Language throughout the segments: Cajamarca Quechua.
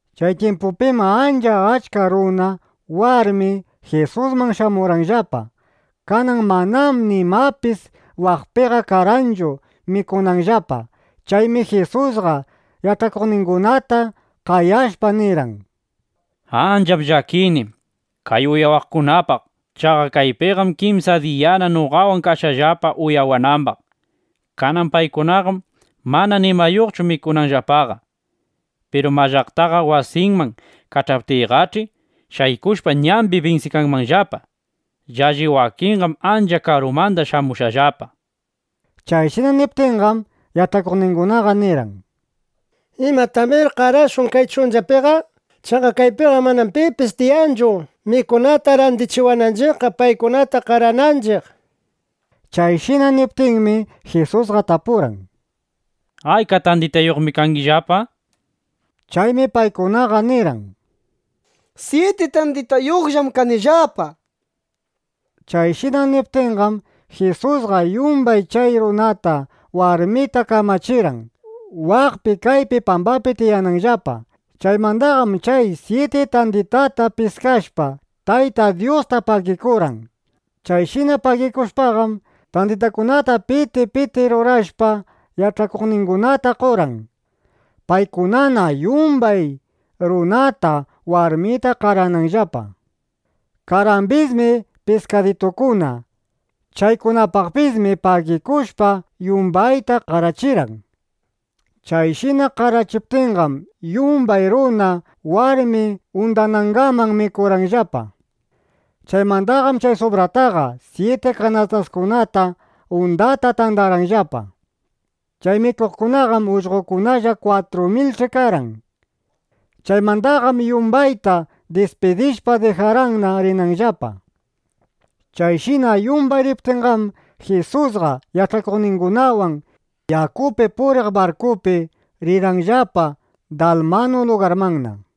Chay tyimpupim ancha achka runa, warmi Jisusman shamurqanllapa. Kanan manam nimapis waqpiqa karqanchu mikunanllapa. Chaymi Jisusqa yach'akuqningunata qayashpa nirqan: —Ancham llakini kay uyawaqkunapaq. Chaqa kaypiqam kimsa diyana noqawan kashqallapa uyawanambaq. Kanan paykunaqam mana nimayuqchu mikunanllapaqa. Piru mallaqtalla wasinman kach'aptiyqach'i, shaykushpa ñambi binsikanmanllapa. Llalli wakinqam ancha karumanda shamushqallapa. Chayshina niptinqam, yach'akuqningunaqa nirqan: —¿Imatamir qarashun kay chunchapiqa? Chaqa kaypiqam mana pipis tiyanchu, mikunata randichiwananchiqqa, paykunata qarananchiq. Chayshina niptinmi, Jisusqa tapurqan: —¿Ayka tanditayuqmi kangillapa? nishpa. Chaymi paykunaqa nirqan: —Syiti tanditayuqllam kanillapa, nishpa. Chayshina niptinqam, Jisusqa yumbay chay runata, warmita kamachirqan, waqpi kaypi pambapi tiyananllapa. Chaymandaqam chay syiti tanditata piskashpa, Tayta Dyusta pagikurqan. Chayshina pagikushpaqam, tanditakunata piti piti rurashpa, yach'akuqningunata qorqan, paykunana yumbay runata, warmita qarananllapa. Karqambismi piskaditukuna. Chaykunapaqpismi pagikushpa, yumbayta qarachirqan. Chayshina qarachiptinqam, yumbay runa, warmi undanangaman mikurqanllapa. Chaymandaqam chay subrataqa syiti kanastakuna undata tandarqanllapa. Chay mikuqkunaqam ullqokunalla 4.000ch'i karqan. Chaymandaqam yumbayta dispidishpa, dijarqanna rinanllapa. Chayshina yumbay riptinqam, Jisusqa yach'akuqningunawan yakupi puriq barkupi rirqanllapa Dalmanu lugarmanna.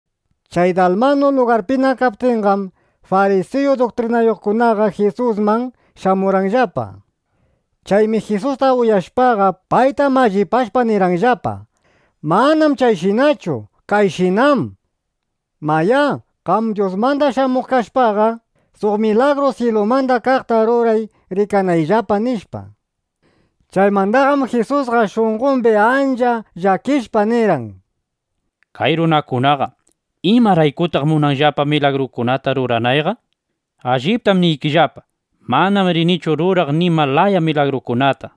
Chay Dalmanu lugarpina kaptinqam, farisiyu duktrinayuqkunaqa Jisusman shamurqanllapa. Chaymi Jisusta uyashpaqa, payta mallipashpa nirqanllapa: —Manam chayshinachu. Kayshinám. Mayá, qam Dyusmanda shamuq kashpaqa, suq milagru syilumanda kaqta ruray rikanayllapa, nishpa. Chaymandaqam Jisusqa shunqombi ancha llakishpa nirqan: —Kay runakunaqa ¿imaraykutaq munanllapa milagrukunata ruranayqa? Alliptam niykillapa, manam rinichu ruraq nima laya milagrukunata, nishpa.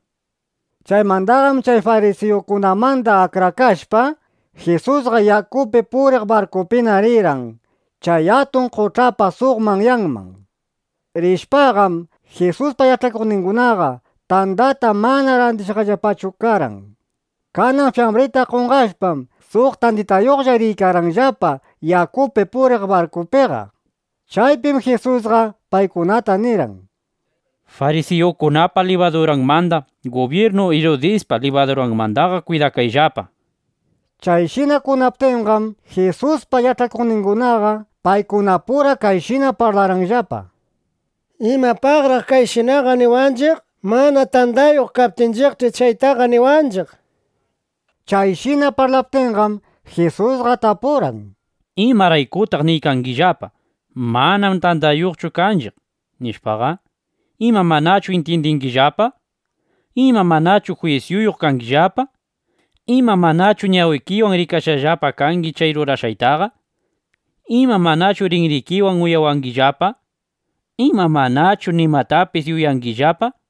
Chaymandaqam chay farisiyukunamanda akrakashpa, Jisusqa yakupi puriq barkupina rirqan chay atun qoch'apa suq manyanman. Rishpaqam, Jisuspa yach'akuqningunaqa tandata mana randishqallapachu karqan. Kanan fyambrinda qonqashpam, suq tanditayuqlla riykarqanllapa yakupi puriq barkupiqa. Chaypim Jisusqa paykunata nirqan: —Farisiyukunapa libaduranmanda, gubyirnu Irudispa libaduranmandaqa kwidakayllapa, nishpa. Chayshina kunaptinqam, Jisuspa yach'akuqningunaqa paykunapura kayshina parlarqanllapa: —¿Imapaqraq chayshinaqa niwanchiq? Mana tandayuq kaptinchiqch'i, chaytaqa niwanchiq, nishpa. Chayshina parlaptinqam, Jisusqa tapurqan: —¿Imaraykutaq niykangillapa: “Manam tandayuqchu kanchiq” nishpaqa? ¿Ima, manachu intyindingillapa? ¿Ima manachu jwisyuyuq kangillapa? ¿Ima manachu ñawikillapawan rikashqallapa kangi chay rurashqaytaqa? ¿Ima manachu rinrikiwan uyawangillapa? ¿Ima manachu nimatapis yuyangillapa?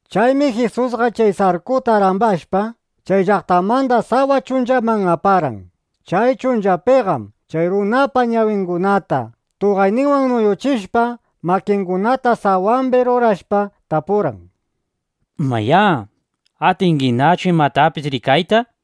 Chaymi Jisusqa chay sarkuta rambashpa, chay llaqtamanda sawa chunchaman aparqan. Chay chunchapiqam chay runapa ñawingunata tuqayninwan nuyuchishpa, makingunata sawambi rurashpa, tapurqan: —Mayá, ¿atinginachu imatapis rikayta? nishpa.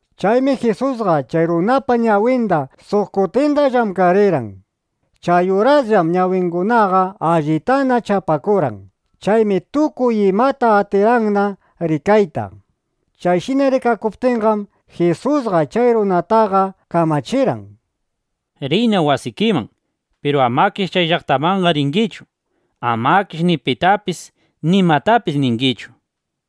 Chaymi Jisusqa chay runapa ñawinda suq kutinda llamkarirqan. Chay urasllam ñawingunaqa allitana chapakurqan. Chaymi tukuy imata atirqanna rikayta. Chayshina rikakuptinqam, Jisusqa chay runataqa kamachirqan: —Riyna wasikiman. Piru amakish chay llaqtamanqa ringichu. ˻Amakish ni pitapis nimatapis ningichu, nishpa.˼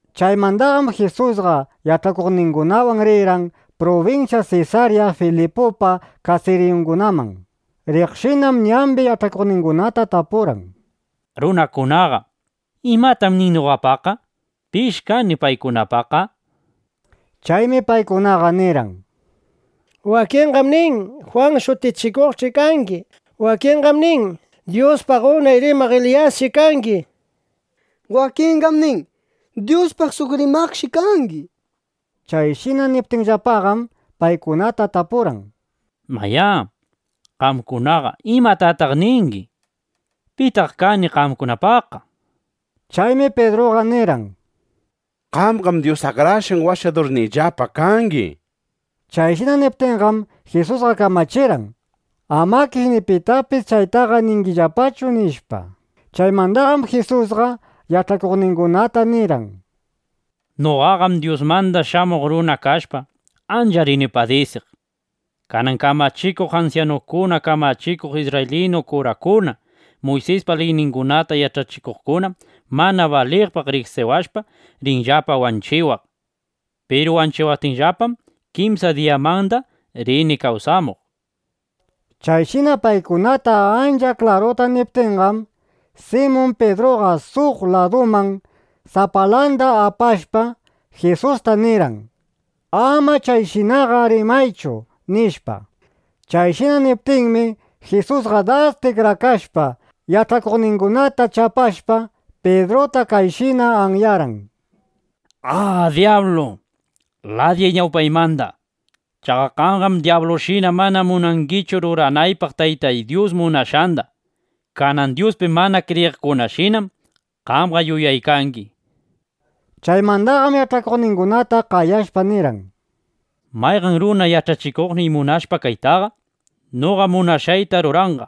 Chaymandaqam Jisusqa yach'akuqningunawan rirqan prubinsya Sesarya Filipupa kasiriyungunaman. Riqshinam ñambi yach'akuqningunata tapurqan: —Runakunaqa, ¿imatam nin noqapaqqa? ¿Pish kani paykunapaqqa? nishpa. Chaymi paykunaqa nirqan: —Wakinqam nin, Jwan Shutichikuqshi kangi. Wakinqam nin, Dyuspaq unay rimaq Eliyasshi kangi. Wakinqam nin, Dyuspaq suq rimaqshi kangi, nishpa. Chayshina niptinllapaqam, paykunata tapurqan: —Mayá, qamkunaqa ¿imatataq ningi? ¿Pitaq kani qamkunapaqqa? nishpa. Chaymi Pidruqa nirqan: —Qamqam Dyus Akrashqan Washadurniyllapa kangi, nishpa. Chayshina niptinqam, Jisusqa kamachirqan: —Amakish ni pitapis chaytaqa ningillapachu, nishpa. Chaymandaqam Jisusqa yach'akuqningunata nirqan: —Noqaqam Dyusmanda Shamuq Runa kashpa, ancha rini padisiq. Kanan kamachikuq ansyanukuna, kamachikuq isrraylinu kurakuna, Muysispa liyningunata yach'achikuqkunam mana baliqpaq riqsiwashpa, rinllapa wanchiwaq. Piru wanchiwaptinllapam, kimsa diyamanda rini kawsamuq, nishpa. Chayshina paykunata ancha klaruta niptinqam, Simun Pidruqa suq laduman sapalanda apashpa, Jisusta nirqan: —Ama chayshinaqa rimaychu, nishpa. Chayshina niptinmi, Jisusqa das tikrakashpa, yach'akuqningunata chapashpa, Pidruta kayshina anyarqan: —¡A dyablu! ¡Ladiyay ñawpaymanda! Chaqa qamqam dyablushina mana munangichu ruranaypaq Taytay Dyus munashqanda. Kanan Dyuspi mana kriyiqkunashinam qamqa yuyaykangi, nishpa. Chaymandaqam yach'akuqningunata qayashpa nirqan: —Mayqan runa yach'akuqniy munashpa kaytaqa, noqa munashqayta ruranqa.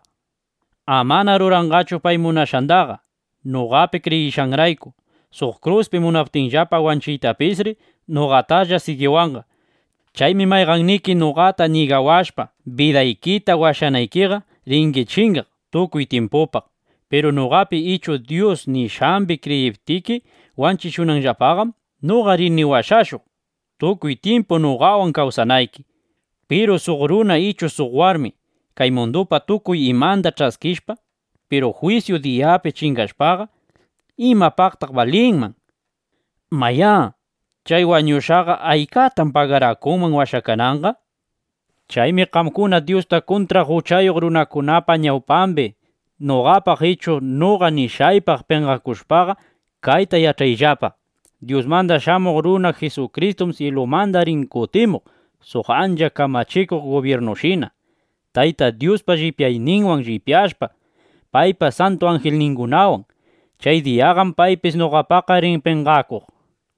Amana ruranqachu pay munashqandaqa. Noqapi kriyishqanrayku suq kruspi munaptinllapa wanchiytapisri, noqatalla sigiwanqa. Chaymi mayqanniki noqata ñigawashpa bidaykita washanaykiqa, ringi chingaq tukuy tyimpupaq. Piru noqapi ichu Dyus nishqambi kriyiptiki wanchishuptinllapaqam, noqa rini washashuq, tukuy tyimpu noqawan kawsanayki. Piru suq runa ichu suq warmi kay mundupa tukuy imanda ch'askishpa, piru jwisyu diyapi chingashpaqa, ¿imapaqtaq balinman? Mayá, chay wañushqaqa, ¿aykatam pagarakunman washakananqa? Chaymi qamkuna Dyusta kuntraq uchayuq runakunapa ñawpambi noqapaq ichu noqa nishqaypaq penqakushpaqa, kayta yach'ayllapa: Dyusmanda Shamuq Runa Jisukristum syilumanda rin kutimuq suq ancha kamachikuq gubyirnushina, Tayta Dyuspa llipyayninwan llipyashpa, paypa santu anjilningunawan. Chay diyaqam paypis noqapaqqa rin penqakuq, nishpa.